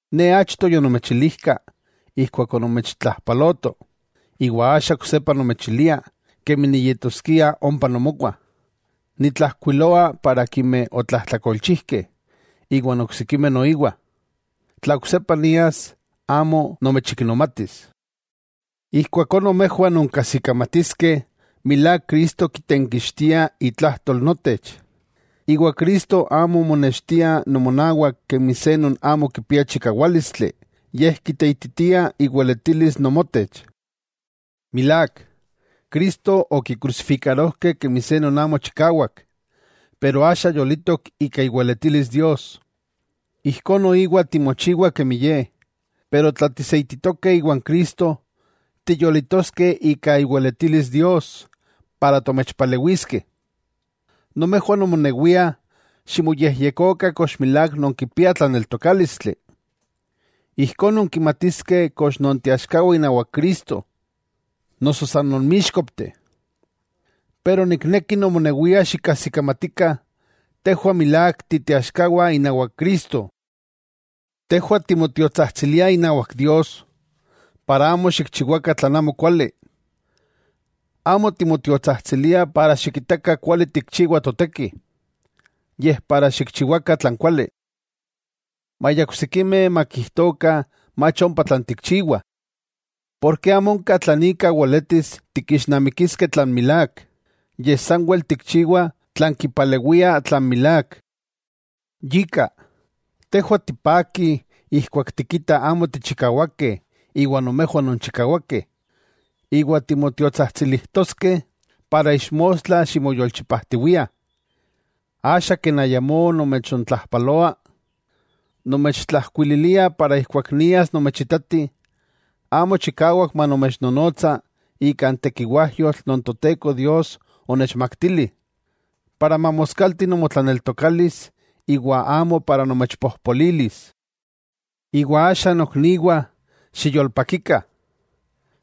Ne achto yonomechilijka ijkuak onomechtlajpaloto, iwa axa oksepa nomechilia kemi niyetoskia ompa nomowah. Nitlajkuiloa para akimeh otlajtlakolchijkeh, iwan oksikimeh noiwa, tla oksepa nias amo nomechiknomatis. Ijkuakó nomejwah nonkajsikamatiskeh milák Cristo kitenkixtia itlajtol notech. Iwa Cristo amo monextia nomonawak kemi se non amo kipia chikawálistli, yej kiteititia iweletilis nomotech. Milák, Cristo okikrusifikarojkeh kemi se non amo chikawak, pero axa yolitok ika iweletilis Dios. Ijkó noiwa timochiwah kemi Ye, pero tla tiseititoskeh iwan Cristo tiyolitoskeh ika iweletilis Dios para tomechpalewiskeh. Nomejwah nomonewiah ximoyejyekokah kox milák nonkipiah tlaneltokálistli. Ijkó nonkimatiskeh kox nonteaxkawah inawak Cristo, noso san nonmíxkopteh. Pero nikneki nomonewiah xikajsikamatikah, tejwah milák titeaxkawah inawak Cristo. Tejwah timotiotsajtsiliah inawak Dios, para amo xikchiwakah tlan amokuali. Amo timotiotsajtsiliah para xikitakah kuali tikchiwah toteki, yej para xikchiwakah tlan kuali; maya oksikimeh makijtokah mach ompa tlan tikchiwah. Porke amo onka tlan ika weletis tikixnamikiskeh tlan milák, yej sanwel tikchiwah tlan kipalewia tlan milák. Yika, tejwah tipakih ijkuak tikitah amo tichikawakeh iwa nomejwah nonchikawakeh, iwa timotiotsajtsilijtoskeh para ixmostla ximoyolchipajtiwiah. Axa ken ayamó nomechontlajpaloa, nomechtlajkuililia para ijkuak nias nomechitati, amo chikawak manomechnonotsa ika n tekiwajyotl non Toteko Dios onechmaktili, para mamoskalti nomotlaneltokalis iwa amo para nomechpojpolilis. Iwa axa nokniwah xiyolpakikah,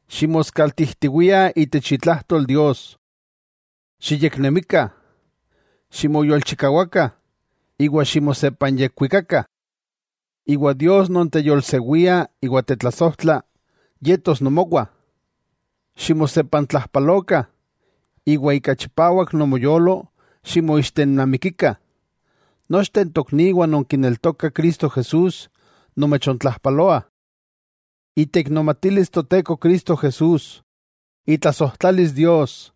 ximoskaltijtiwiah itech itlajtol Dios, xiyeknemikah, ximoyolchikawakah iwa ximosepanyekwikakah. Iwa Dios non teyolsewia iwa tetlasojtla, yetos nomowah. Ximosepantlajalokah iwa ika chipawak nomoyolo ximoixtenamikikah. Nochteh n tokniwah non kineltokah Cristo Jesús nomechontlajpaloah. Iteiknomatilis Toteko Cristo Jesús, itlasojtlalis Dios,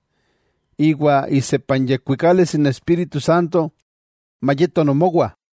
iwa isepanyekuikalis n Espíritu Santo mayeto nomowah.